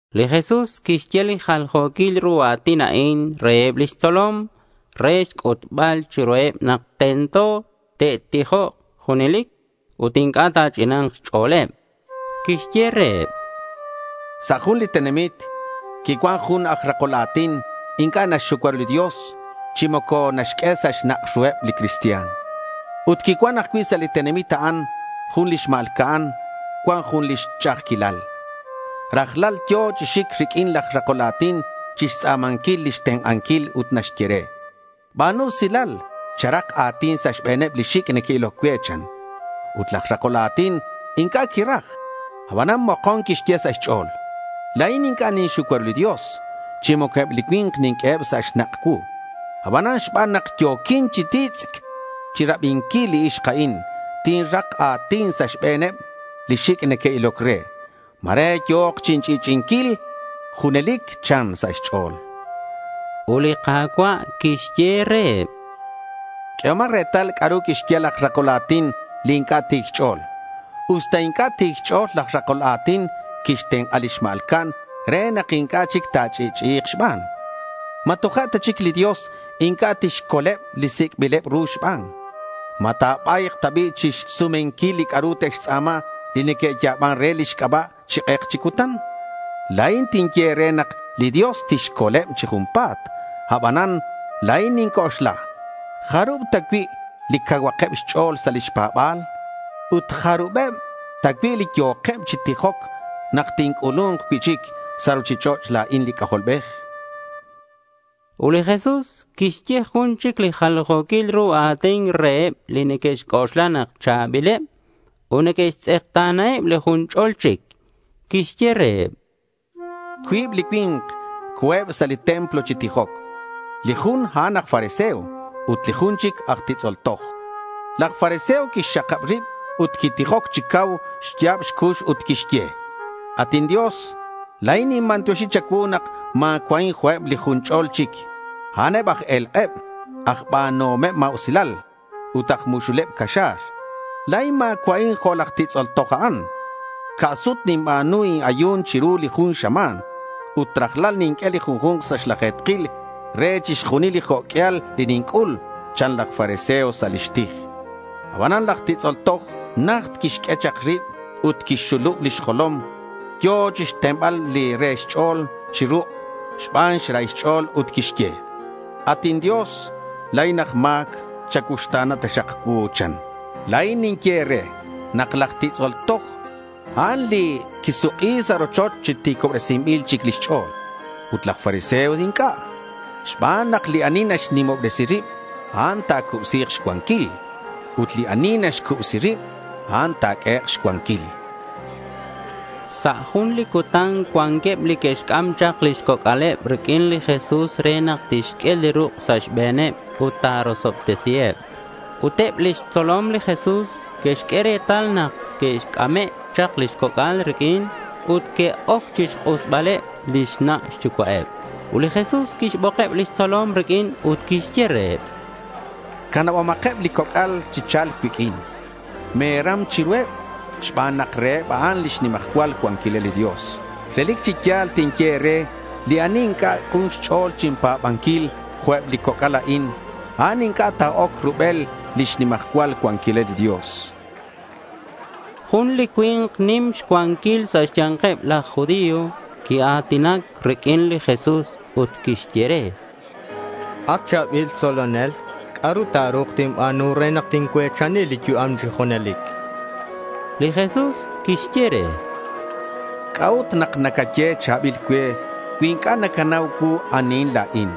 Li Jesús quixye li jaljo̱quil ru a̱tin a'in reheb lix tzolom re xc'utbal chiruheb nak tento te'tijok junelic ut inc'a' ta̱ch'ina̱nk xch'o̱leb. Quixye reheb: Sa' jun li tenamit quicuan jun aj rakol a̱tin inc'a' naxxucua ru li Dios, chi moco naxq'ue sa' xnak' ru li cristian. Ut quicuan ajcui' sa' li tenamit a'an jun li xma̱lca'an cuan jun lix ch'a'ajquilal. Rajlal yo̱ chi xic riq'uin laj rakol a̱tin chixtz'a̱manquil lix tenk'anquil ut naxye re: —Ba̱nu usilal, charak a̱tin sa' xbe̱neb li xic' neque'iloc cue, chan. Ut laj rakol a̱tin inc'a' quiraj. Abanan mokon quixye sa' xch'o̱l: —La̱in inc'a' ninxucua ru li Dios chi moco eb li cui̱nk ninq'ueheb sa' xnak' cuu. Abanan xban nak yo̱quin chi titz'c chirabinquil li ixk a'in, tinrak a̱tin sa' xbe̱neb li xic' neque'iloc re. Ma̱re yo̱k chinch'i'ch'i'inquil junelic, chan sa' xch'o̱l. Ut li Ka̱cua' quixye reheb: —Q'uehomak retal c'a'ru quixye laj rakol a̱tin li inc'a' ti̱c xch'o̱l. Usta inc'a' ti̱c xch'o̱l, laj rakol a̱tin quixtenk'a li xma̱lca'an re nak inc'a' chic ta̱ch'i'ch'i'i̱k xban. ¿Ma toja' ta chic li Dios inc'a' tixcoleb li sic'bileb ru xban? ¿Ma ta̱ba̱yk ta bi' chixsumenquil li c'a'ru te'xtz'a̱ma li neque'ya̱ban re lix c'aba' chi k'ek chi cutan? La̱in tinye e̱re nak li Dios tixcoleb chi junpa̱t. Abanan la̱in ninc'oxla, ¿jarub ta cui' li cauhakeb xch'o̱l sa' lix pa̱ba̱l? Ut, ¿jarubeb ta cui' li yo̱keb chi tijoc nak tinc'ulu̱nk cui'chic sa' ruchich'och' la̱in li C'ajolbej? Ut li Jesús quixye jun chic li jaljo̱quil ru a̱tin reheb li neque'xc'oxla nak cha̱bileb ut neque'xtz'ekta̱naheb li jun ch'ol chic. Quixye reheb: Cuib li cui̱nk co̱eb sa' li templo chi tijoc. Li jun, a'an aj fariseo. Ut li jun chic aj titz'ol toj. Laj fariseo quixxakab rib ut quitijoc chi cau xya̱b xcux ut quixye: —At inDios, la̱in ninbantioxi cha̱cuu nak ma̱cua'in jo'queb li jun ch'ol chic. A'an eb aj e̱lk'eb, aj ba̱nuhom ma̱usilal, ut aj muxuleb caxa̱r. La̱in ma̱cua'in jo' laj titz'ol toj a'an. Ca' sut ninba̱nu in-ayu̱n chiru li jun xama̱n. Ut rajlal ninq'ue li junju̱nk sa' xlaje̱tkil re chixjunil li jo' q'uial li ninc'ul, chan laj fariseo sa' lix tij. Abanan laj titz'ol toj najt quixq'ue chak rib ut quixxulub lix jolom. Yo̱ chixtenbal li re xch'o̱l chi ruk' xban xrahil xch'o̱l ut quixye: —At inDios, la̱in aj ma̱c. Chacuuxta̱na taxak cuu, chan. La̱in ninye e̱re nak laj titz'ol toj, a'an li quisuk'i sa' rochoch chi ti̱cobresinbil chic lix ch'o̱l. Ut laj fariseo inc'a', xban nak li ani naxnimobresi rib, a'an ta̱cubsi̱k xcuanquil. Ut li ani naxcubsi rib, a'an ta̱q'uehek' xcuanquil, chan li Jesús. Sa' jun li cutan cuanqueb li que'xc'am chak lix coc'aleb riq'uin li Jesús re nak tixq'ue li ruk' sa' xbe̱neb ut ta̱rosobtesiheb. Ut eb lix tzolom li Jesús que'xq'ue retal nak que'c'ame' chak li coc'al riq'uin ut que'oc chixk'usbaleb lix na' xyucua'eb. Ut li Jesús quixbokeb lix tzolom riq'uin ut quixye reheb: —Canabomakeb li coc'al chi cha̱lc cuiq'uin. Me̱ram chiruheb xban nak reheb a'an lix nimajcual cuanquilal li Dios. Relic chi ya̱l tinye e̱re li ani inc'a' k'un xch'o̱l chinpa̱banquil jo'queb li coc'al a'in, a'an inc'a' ta̱oc rubel lix nimajcual cuanquilal li Dios, chan. Jun li cui̱nk nim xcuanquil sa' xya̱nkeb laj judío quia̱tinac riq'uin li Jesús ut quixye re: —At cha̱bil tzolonel, ¿c'a'ru ta̱ru̱k tinba̱nu re nak tincue̱chani li yu'am chi junelic? chan. Li Jesús quixye re: —¿C'a'ut nak nacaye cha̱bil cue cui inc'a' nacanau anihin la̱in?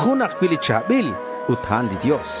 Jun ajcui' li cha̱bil ut a'an li Dios.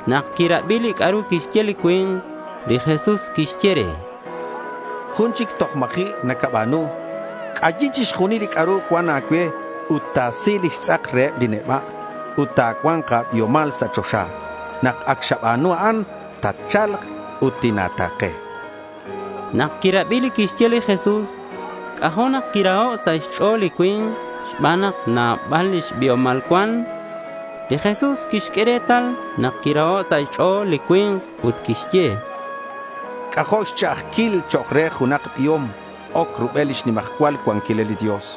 Nak quirabi li c'a'ru quixye li cui̱nk, li Jesús quixye re: —Jun chic toj ma̱ji' nacaba̱nu. C'ayi chixjunil li c'a'ru cuan a̱cue ut ta̱si lix tz'ak reheb li neba' ut ta̱cua̱nk a̱biomal sa' choxa. Nak ac xaba̱nu a'an, tatcha̱lk ut tina̱ta̱ke, chan li Jesús re. Nak quirabi li quixye li Jesús, c'ajo' nak quiraho' sa' xch'o̱l li cui̱nk xban nak nabal lix biomal cuan. Li Jesús quixq'ue retal nak quiraho' sa' xch'o̱l li cui̱nk ut quixye: —C'ajo' xch'a'ajquil chok' re junak biom oc rubel lix nimajcual cuanquilal li Dios.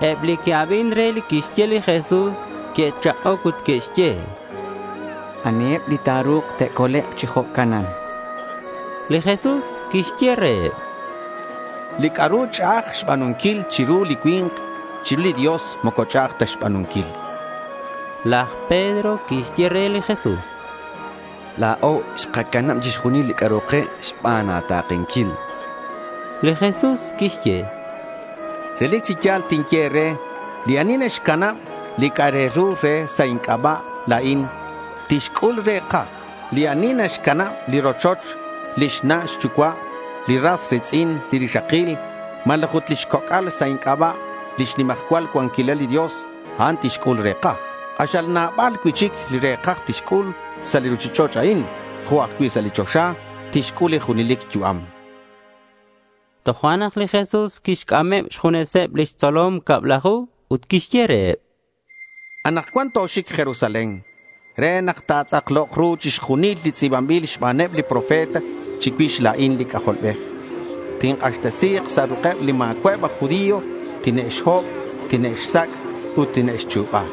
Eb li que'abin re li quixye li Jesús, que'chak'oc ut que'xye: —¿Aniheb li ta̱ru̱k te'colek' chi jo'canan? chanqueb. Li Jesús quixye reheb: —Li c'a'ru ch'a'aj xba̱nunquil chiru li cui̱nk, chiru li Dios moco ch'a'aj ta xba̱nunquil, chan. Laj Pedro quixye re li Jesús: —La̱o xkacanab chixjunil li c'a'ru ke xban a̱ta̱kenquil, chan. Li Jesús quixye: —Relic chi ya̱l tinye e̱re, li ani naxcanab li c'a'ru re sa' inc'aba' la̱in, tixc'ul re̱kaj. Li ani naxcanab li rochoch, lix na' xyucua', li ras ri̱tz'in, li rixakil, malaj ut lix coc'al sa' xc'aba' lix nimajcual cuanquilal li Dios, a'an tixc'ul re̱kaj. K'axal nabal cui'chic li re̱kaj tixc'ul sa' li ruchich'och' a'in, jo' ajcui' sa' li choxa tixc'ul li junelic yu'am, chan li Jesús. Tojo'nak li Jesús quixc'ameb xjuneseb lix tzolom cablaju ut quixye reheb: —Anakcuan toxic Jerusalén re nak ta̱tz'aklok ru chixjunil li tz'i̱banbil xbaneb li profeta chicuix la̱in li C'ajolbej. Tink'axtesi̱k sa' ruk'eb li ma̱cua'eb aj judío. Tine'xhob, tine'xsac' ut tine'xchu̱ba.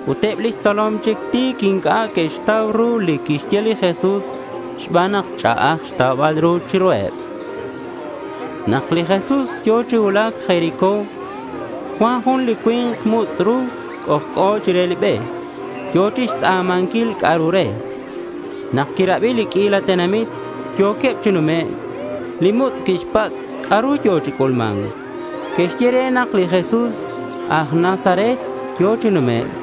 Ut eb lix tzolom chi ti̱c inc'a' que'xtau ru li quixye li Jesús xban nak ch'a'aj xtaubal ru chiruheb. Nak li Jesús yo̱ chi cuulac Jericó, cuan jun li cui̱nk mutz' ru c'ojc'o chire li be. Yo̱ chixtz'a̱manquil c'a'ru re. Nak quirabi li q'uila tenamit yo̱queb chi numec', li mutz' quixpatz' c'a'ru yo̱ chi c'ulma̱nc. Que'xye re nak li Jesús aj Nazaret yo̱ chi numec'.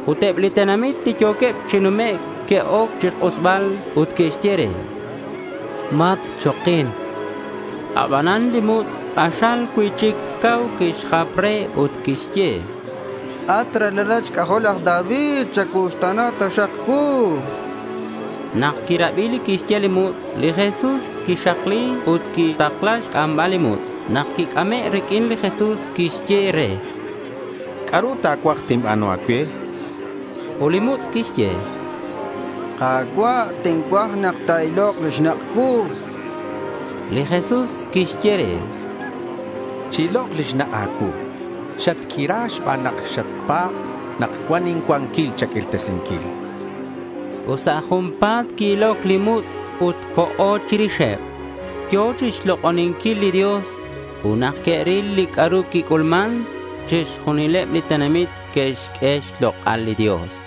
Ut eb li tenamit li yo̱queb chi numec' que'oc chixk'usbal ut que'xye re: —Matchokin, chanqueb re. Abanan li mutz' k'axal cui'chic cau quixjap re ut quixye: —At ralalat xc'ajol laj David, chacuuxta̱na cuu, chan. Nak quirabi li quixye li mutz', li Jesús quixakli ut quixtakla xc'ambal li mutz'. Nak quic'ame' riq'uin, li Jesús quixye re: —¿C'a'ru ta̱cuaj tinba̱nu a̱cue? chan. Ut li mutz' quixye: —Ka̱cua', tincuaj nak ta̱ilok li xnak' cuu, chan. Li Jesús quixye re: —Chi-ilok li xnak' a̱cuu. Xatq'uira xban nak xapa̱b nak cuan incuanquil cha̱q'uirtesinquil, chan. Ut sa' junpa̱t qui-iloc li mutz' ut co̱ chirixeb. Yo̱ chixlok'oninquil li Dios. Ut nak que'ril li c'a'ru quic'ulman, chixjunileb li tenamit que'xq'ue xlok'al li Dios.